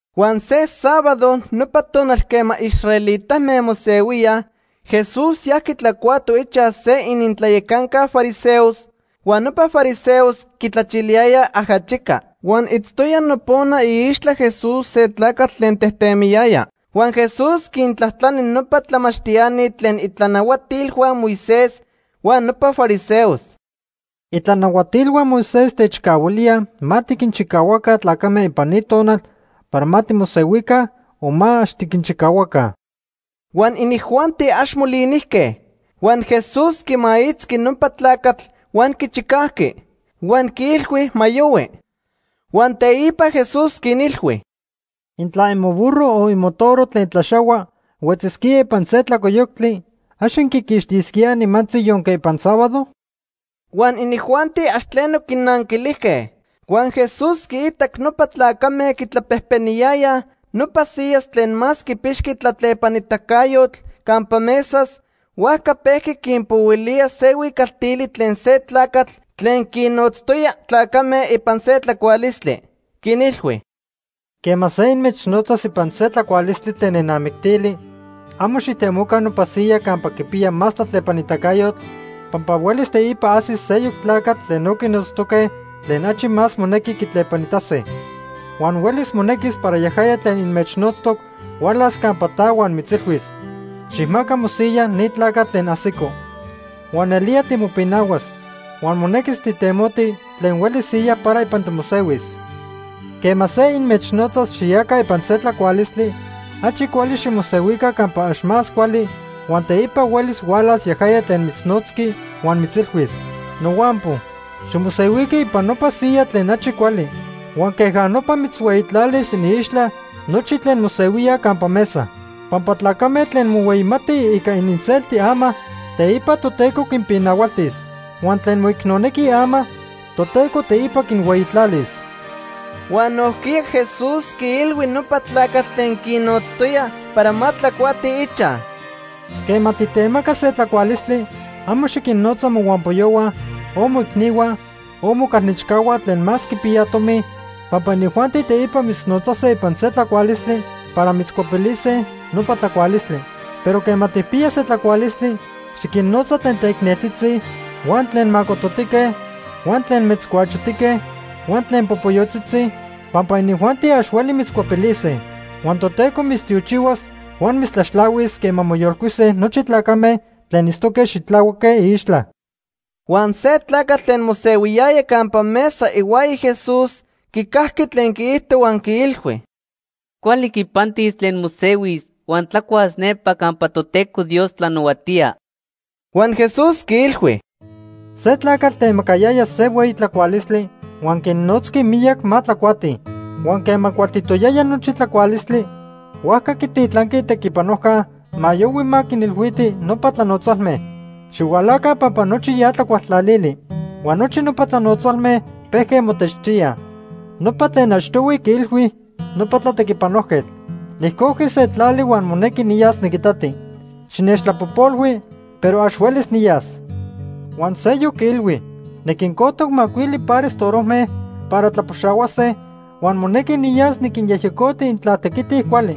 Huan se sábado nopa tonal quema israelitame mosehuíaj, Jesús yajqui tlacuato ichaj se inintlayacanca fariseos, huan nopa fariseos quitlachiliyayaj ajachica. Huan itztoya nopona iixtla Jesús se tlacatl tlen tejtemiyaya. Huan Jesús quintlajtlani nopa tlamachtiani tlen itlanahuatilhua Moisés huan nopa fariseos: ―¿Itlanahuatilhua Moisés techcahuilíaj ma tiquinchicahuaca tlacame ipan ni tonal para ma timosehuica o ma ax tiquinchicahuaca? Huan inijuanti ax molinijque. Huan Jesús quimaitzqui nopa tlacatl huan quichicajqui. Huan quiilhui ma yohui. Huan teipa Jesús quinilhui: ―Intla imoburro o imotoro tlen tlaxahua huetzisquía ipan se tlacoyoctli, ¿ax inquiquixtisquíaj nimantzi yonque ipan sábado? Huan inijuanti ax tleno quinanquilijque. Huan Jesús quiitac nopa tlacame quitlapejpeniyayaj nopa siyas tlen más quipixqui tlatlepanitacayotl campa mesas, huajca pejqui quinpohuilía se huicaltili tlen se tlacatl tlen quinnotztoya tlacame ipan se tlacualistli. Quinilhui: ―Quema se inmechnotzas ipan se tlacualistli tlen nenamictili, amo xijtemoca nopa siya campa quipiya más tlatlepanitacayotl pampa huelis teipa ajsis seyoc tlacatl tlen no quinotztoque tlen achi más monequi quitlepanitase. Huan huelis monequis para yajaya tlen inmechnotztoc hualas campa ta huan mitzilhuis: ‘Xijmaca mosiya ni tlacatl tlen ajsico.’ Huan nelía timopinahuas huan monequis tijtemoti tlen hueli siya para ipan timosehuis. Quema se inmechnotzas xiyaca ipan se tlacualistli, achi cuali ximosehuica campa ax más cuali huan teipa huelis hualas yajaya tlen mitznotzqui huan mitzilhuis: ‘Nohuampo, ximosehuiqui ipan nopa siya tlen achi cuali.’ Huan queja nopa mitzhueyitlalis iniixtla nochi tlen mosehuíaj campa mesa. Pampa tlacame tlen mohueyimatij ica ininselti ama, teipa Toteco quinpinahualtis. Huan tlen moicnonequij ama, Toteco teipa quinhueyitlalis. Huan nojquiya Jesús quiilhui nopa tlacatl tlen quinnotztoya para ma tlacuatij ichaj: ―Quema titemaca se tlacualistli, amo xiquinnotza mohuampoyohua, o moicnihua, o mocalnechcahua tlen más quipiyaj tomi, pampa inijuanti teipa mitznotzase ipan se tlacualistli para mitzcuepilise nopa tlacualistli. Pero quema tijpiya se tlacualistli, xiquinnotza tlen teicneltzitzi huan tlen macototique huan tlen metzcuachotique huan tlen popoyotzitzi, pampa inijuanti ax hueli mitzcuepilise. Huan Toteco mitztiochihuas huan mitztlaxtlahuis quema moyolcuise nochi tlacame tlen itztoque xitlahuaque iixtla. Huan se tlacatl tlen mosehuiyaya campa mesa ihuaya Jesús quicajqui tlen quiijto huan quiilhui: ―Cuali quipantis tlen mosehuis huan tlacuas nepa campa Toteco Dios tlanahuatía. Huan Jesús quiilhui: ―Se tlacatl temacayaya se hueyi tlacualistli huan quinnotzqui miyac ma tlacuatij. Huan quema cualtitoyaya nochi tlacualistli, huajca quititlanqui itequipanojca ma yohui ma quinilhuiti nopa tlanotzalme: ‘Xihualaca pampa nochi ya tlacuajtlalili.’ Huan nochi nopa tlanotzalme pejque motechtíaj. Nopa tlen achtohui quiilhui nopa tlatequipanojquetl: ‘Nijcojqui se tlali huan monequi niyas niquitati. Xinechtlapojpolhui, pero ax huelis niyas.’ Huan seyoc quiilhui: ‘Niquincojtoc macuili pares torojme para tlapoxahuase huan monequi niyas niquinyejyecoti intla tequitij cuali.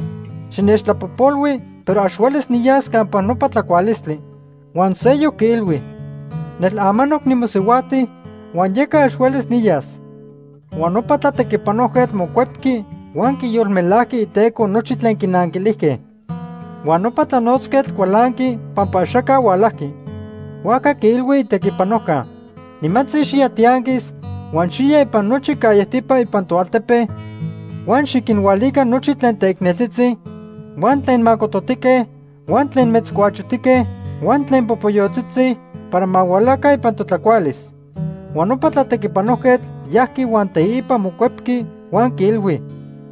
Xinechtlapojpolhui, pero ax huelis niyas campa nopa tlacualistli.’ Huan seyoc quiilhui: ‘Nel amanoc nimosihuajti huan yeca ax huelis niyas.’ “Huan nopa tlatequipanojquetl mocuepqui huan quiyolmelajqui iteco nochi tlen quinanquilijque. Huan nopa tlanotzquetl cualanqui pampa axaca hualajqui. Huajca quiilhui itequipanojca: ‘Nimantzi xiya tianquis huan xiya ipan nochi callejtipa ipan toaltepe, huan xiquinhualica nochi tlen teicneltzitzi, huan tlen macototique, huan tlen metzcuachotique huan tlen popoyotzitzi para ma hualaca ipan totlacualis.’ Huan nopa tlatequipanojquetl yajqui huan teipa mocuepqui huan quiilhui: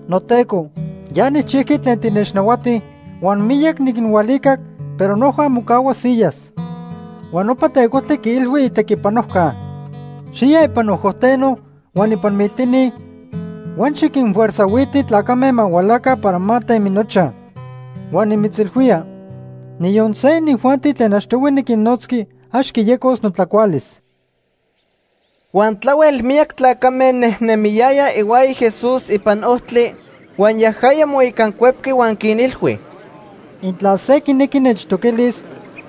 ‘Noteco, ya nijchijqui tlen tinechnahuati huan miyac niquinhualicac, pero noja mocahua siyas.’ Huan nopa tecojtli quiilhui itequipanojca: ‘Xiya ipan ojoteno huan ipan miltini huan xiquinfuerzajhuiti tlacame ma hualaca para ma temi nochaj. Huan nimitzilhuía, niyon se inijuanti tlen achtohui niquinnotzqui ax quiyecos notlacualis.’” Huan tlahuel miyac tlacame nejnemiyayaj ihuaya Jesús ipan ojtli, huan yajaya moicancuepqui huan quinilhui: “Intla se quinequi nechtoquilis,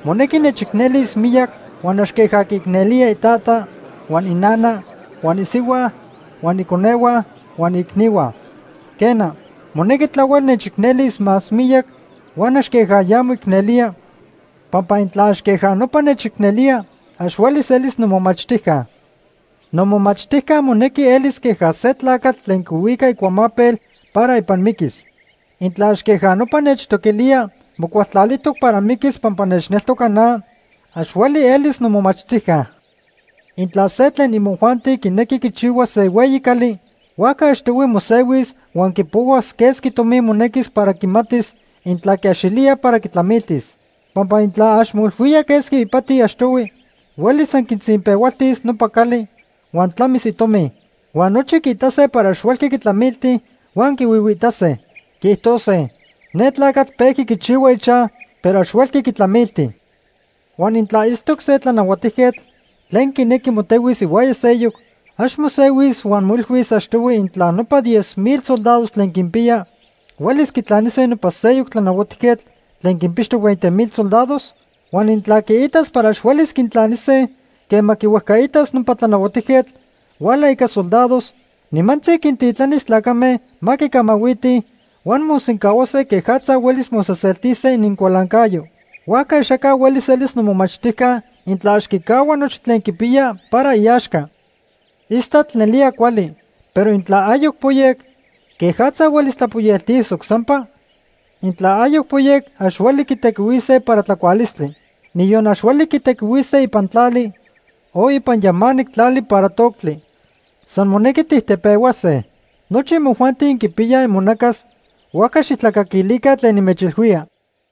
monequi nechicnelis miyac huan ax queja quiicnelía itata, huan inana, huan isihua, huan iconehua huan iicnihua. Quena, monequi tlahuel nechicnelis más miyac huan ax queja ya moicnelía, pampa intla ax queja nopa nechicnelía, ax huelis elis nomomachtijca. Nomomachtijca monequi elis queja se tlacatl tlen quihuica icuamapel para ipan miquis. Intla ax queja nopa nechtoquilía mocualtlalijtoc para miquis pampa nechneltoca na, ax hueli elis nomomachtijca. “Intla se tlen imojuanti quinequi quichihuas se hueyi cali, huajca achtohui mosehuis huan quipohuas quesqui tomi monequis para quimatis intla quiaxilía para quitlamiltis. Pampa intla ax moilhuía quesqui ipati achtohui, huelis san quitzinpehualtis nopa cali huan tlamis itomi. Huan nochi quiitase para ax huelqui quitlamilti huan quihuihuiitase. Quiijtose: ‘Ne tlacatl pejqui quichihua ichaj, pero ax huelqui quitlamilti.’ “Huan intla itztoc se tlanahuatijquetl tlen quinequi motehuis ihuaya seyoc, ¿ax mosehuis huan moilhuis achtohui intla nopa diez mil soldados tlen quinpiya huelis quitlanise nopa seyoc tlanahuatijquetl tlen quinpixtoc veinte mil soldados? Huan intla quiitas para ax huelis quintlanise, quema quihuejcaitas nopa tlanahuatijquetl huala ica isoldados, nimantzi quintitlanis tlacame ma quicamahuitij, huan mosencahuase quejatza huelis mosejseltise inincualancayo. Huajca axaca huelis elis nomomachtijca intla ax quicahua nochi tlen quipiya para iaxca. “Istatl nelía cuali, pero intla ayoc poyec, ¿quejatza huelis tlapoyeltisoc sampa? Intla ayoc poyec ax hueli tijtequihuise para tlacualistli. Niyon ax hueli tijtequihuise ipan tlali, o ipan yamanic tlali para toctli. San monequi tijtepehuase. Nochi imojuanti inquipiyaj imonacas, huajca xijtlacaquilica tlen nimechilhuía.”